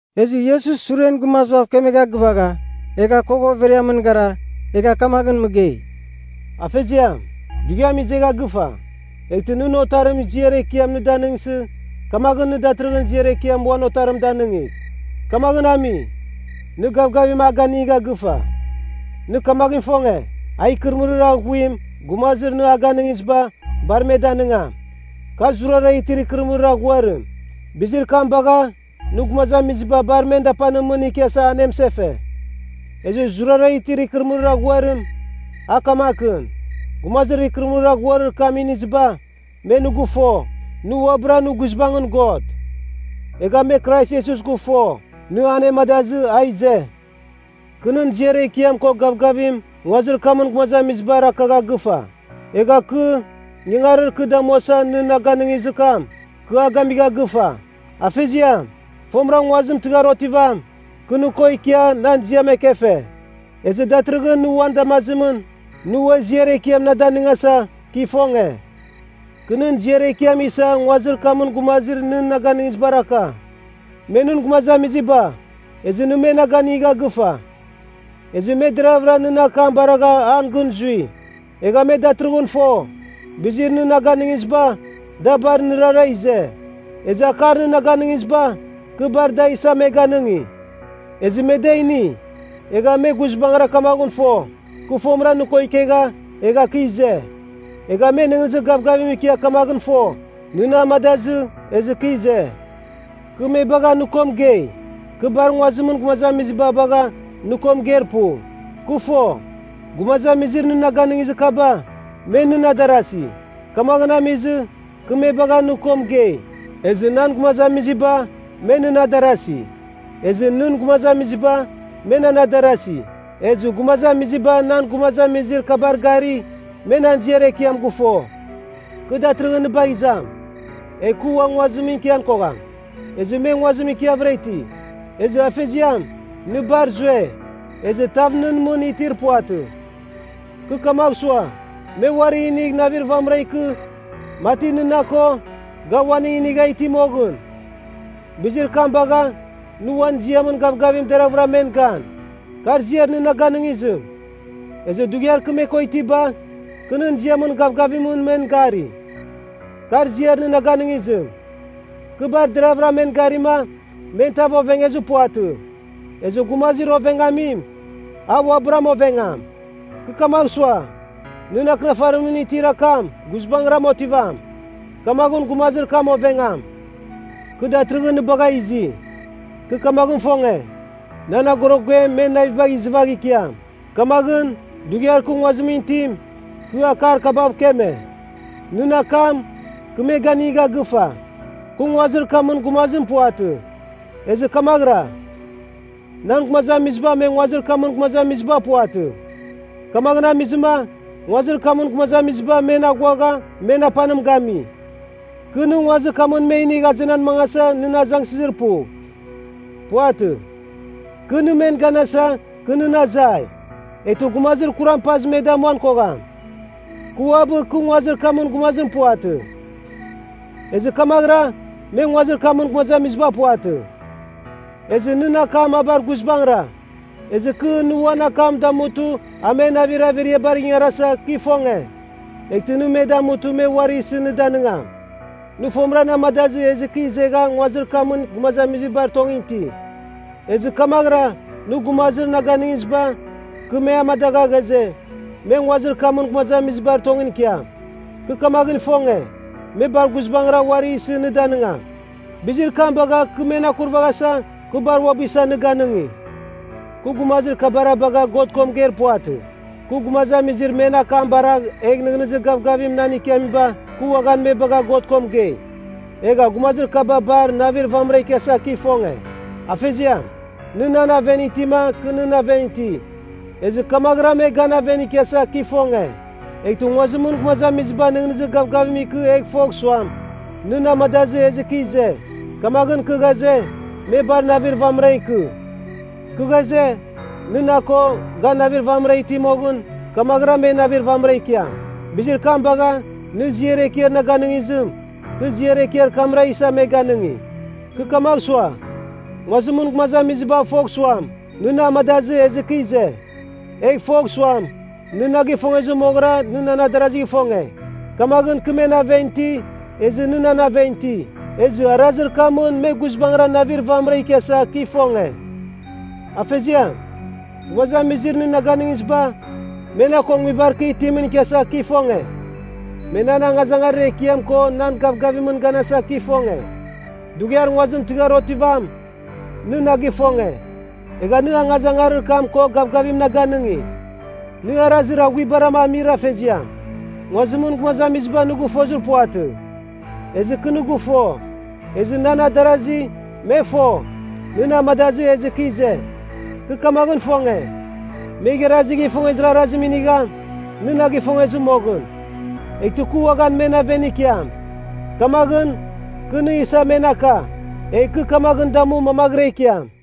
Ezɨ Iesus suren gumazibav kemegha gɨvagha, egha kogha overiamɨn gara, egha kamaghɨn mɨgei, “Afeziam, dughiam izegha gɨfa. Eghtɨ nɨn Otarim ziar ekiam nɨ danɨngsɨ, kamaghɨn nɨ datɨrɨghɨn ziar ekiam uan Otarim danɨngigh. Kamaghɨn ami, nɨ gavgavim a ganigha gɨfa. Nɨ kamaghɨn ifonge, a ikɨrɨmɨrir aghuim gumazir nɨ a ganɨngiziba, bar me danɨngam. Kar zurara itir ikɨrɨmɨrir aghuarim. Bizir kam bagha, nɨ gumazamiziba bar men dapanimɨn ikiasa anemɨsefe. Ezɨ zurara itir ikɨrɨmɨrir aghuarim, a kamakɨn: Gumazir ikɨrɨmɨrir aghuarir kam iniziba, me nɨ gɨfo, nɨ uabɨra nɨ guizbangɨn God. Egha me Krais Iesus gɨfo, nɨ anemadazɨ a ize. “Kɨ nɨn ziar ekiam ko gavgavim nguazir kamɨn gumazamizibar akagha gɨfa. Egha kɨ, ingangarir kɨ damuasa nɨ na ganɨngizir kam, kɨ a gamigha gɨfa. Afeziam, fomɨra nguazim tɨghar otivam, kɨ nɨ ko ikia nan ziam ekefe. Ezɨ datɨrɨghɨn nɨ uan damazimɨn, nɨ ua ziar ekiam na danɨngasa, kɨ ifonge. “Kɨ nɨn ziar ekiam isa nguazir kamɨn gumazir nɨ na ganɨngizibar aka. Me nɨn gumazamiziba, ezɨ nɨ me na ganigha gɨfa. Ezɨ me deravɨra nɨn akam baragha an gɨn zui. Egha me datɨrɨghɨn fo, bizir nɨ na ganɨngiziba, da bar nɨrara ize. Ezɨ akar nɨ na ganɨngiziba, kɨ bar da isa me ganɨngi. Ezɨ me da ini, egha me guizbangɨra kamaghɨn fo, kɨ fomɨra nɨ ko ikegha, egha kɨ ize. Egha me nɨghnɨzir gavgavim ikia kamaghɨn fo, nɨ na amadazɨ ezɨ kɨ ize. “Kɨ me bagha nɨ ko mɨgei. Kɨ bar nguazimɨn gumazamiziba bagha nɨ ko mɨgeir pu. Kɨ fo, gumazamizir nɨ na ganɨngizir kaba, me nɨn adarasi. Kamaghɨn amizɨ, kɨ me bagha nɨ ko mɨgei. Ezɨ nan gumazamiziba, me nɨn adarasi. Ezɨ nɨn gumazamiziba, me nan adarasi. Ezɨ gumazamiziba nan gumazamizir kabar gari, me nan ziar ekiam gɨfo. “Kɨ datɨrɨghɨn nɨ bagh izam, egh kɨ ua nguazimɨn ikian kogham. Ezɨ me nguazimɨn ikiavɨra iti. Ezɨ Afeziam, nɨ bar zue ezɨ tav nɨn mɨn itir puvatɨ! Kɨ kamagh sua, me uari inigh navir vamɨra ikɨ, mati nɨ na ko, ga uaning inigha iti moghɨn. Bizir kam bagha, nɨ uan ziamɨn gavgavimɨn deravɨra men gan. Kar ziar nɨ na ganɨngizim. Ezɨ dughiar kɨ me ko itiba, kɨ nɨn ziamɨn gavgavimɨn men gari. Kar ziar nɨ na ganɨngizim. Kɨ bar deravɨra men garima men tav ovengezir puvatɨ. Ezɨ gumazir ovengamim, a uabɨram ovengam. Kɨ kamagh sua, nɨn Akɨnafarimɨn itir akam guizbangɨra otivam, kamaghɨn gumazir kam ovengam. “Kɨ datɨrɨghɨn nɨ bagha izi. Kɨ kamaghɨn ifonge, nan agorogem men navibagh izɨvagh ikiam. Kamaghɨn, dughiar kɨ nguazimɨn itim, kɨ akar kabav mɨkeme. “Nɨn akam, kɨ me ganigha gɨfa. Kɨ nguazir kamɨn gumazim puvatɨ. Ezɨ kamaghɨra, nan gumazamiziba me nguazir kamɨn gumazamiziba puvatɨ. Kamaghɨn amizɨma, nguazir kamɨn gumazamiziba men aghuagha men apanim gami. Kɨ, nɨ nguazir kamɨn me inigh azenan mangasa nɨn azangsɨzir pu. Puvatɨ. Kɨ, nɨ men ganasa, kɨ nɨn azai, eghtɨ Gumazir Kuram pazɨ me damuan kogham. Kɨ uabɨ kɨ nguazir kamɨn gumazim puvatɨ. Ezɨ kamaghɨra, me nguazir kamɨn gumazamiziba puvatɨ. Ezɨ nɨn akam a bar guizbangɨra. Ezɨ kɨ, nɨ uan akam damutɨ a men navir averiabar ingarasa, kɨ ifonge. Eghtɨ nɨ me damutɨ me uari isɨ nɨ danɨngam Nɨ fomɨra na amadazɨ ezɨ kɨ izegha nguazir kamɨn gumazamizibar tongɨn iti. Ezɨ kamaghɨra nɨ gumazir na ganɨngiziba, kɨ me amadagha ghaze, me nguazir kamɨn gumazamizibar tongɨn ikiam. Kɨ kamaghɨn ifonge, me bar guizbangɨra uari isɨ nɨ danɨngam. Bizir kam bagha kɨ men akurvaghasa, kɨ bar uabɨ isa nɨ ganɨngi. “Kɨ gumazir kabara bagha God ko mɨgeir puvatɨ. Kɨ, gumazamizir men akam baragh egh nɨghnɨzir gavgavim nan ikiamiba, kɨ uaghan me bagha God ko mɨgei. Egha gumazir kaba bar navir vamɨra ikiasa kɨ ifonge. Afeziam, nɨ nan aven itima kɨ nɨn aven iti, ezɨ kamaghɨra me gan aven ikiasa kɨ ifonge. Eghtɨ nguazimɨn gumazamiziba nɨghnɨzir gavgavim ikɨ egh fogh suam, nɨ na amadazɨ ezɨ kɨ ize. Kamaghɨn kɨ ghaze, me bar navir vamɨra ikɨ. Kɨ ghaze, nɨ na ko, ga navir vamɨra iti moghɨn, kamaghɨra me navir vamɨra ikiam. Bizir kam bagha, nɨ ziar ekiar na ganɨngizim, kɨ ziar ekiar kamra isa me ganɨngi. Kɨ kamagh sua, nguazimɨn gumazamiziba fogh suam, nɨ na amadazɨ ezɨ kɨ ize. Egh fogh suam, nɨ na gifongezɨ moghɨra nɨ nan adarazigh ifonge. Kamaghɨn kɨ men aven iti, ezɨ nɨ nan aven iti, ezɨ arazir kamɨn me guizbangɨra navir vamɨra ikiasa kɨ ifonge. “Afeziam, gumazamizir nɨ na ganɨngiziba, me na ko nguibar kɨ itimɨn ikiasa kɨ ifonge. Me nan angazangarir ekiam ko nan gavgavimɨn ganasa kɨ ifonge. Dughiar nguazim tɨghar otivam, nɨ na gifonge, egha nɨ angazangarir kam ko gavgavim na ganɨngi. “Nɨ Arazir Aghuibara Amir Afeziam, nguazimɨn gumazamiziba nɨ gɨfozir puvatɨ. Ezɨ kɨ nɨ gɨfo. Ezɨ nan adarasi, me fo, nɨ na amadazɨ ezɨ kɨ ize. Kɨ kamaghɨn ifonge, me igharazigh ifongezir arazim inigham, nɨ na gifongezɨ moghɨn. Eghtɨ kɨ uaghan men aven ikiam. Kamaghɨn kɨ nɨ isa men aka, egh kɨ kamaghɨn damu mamaghɨra ikiam.”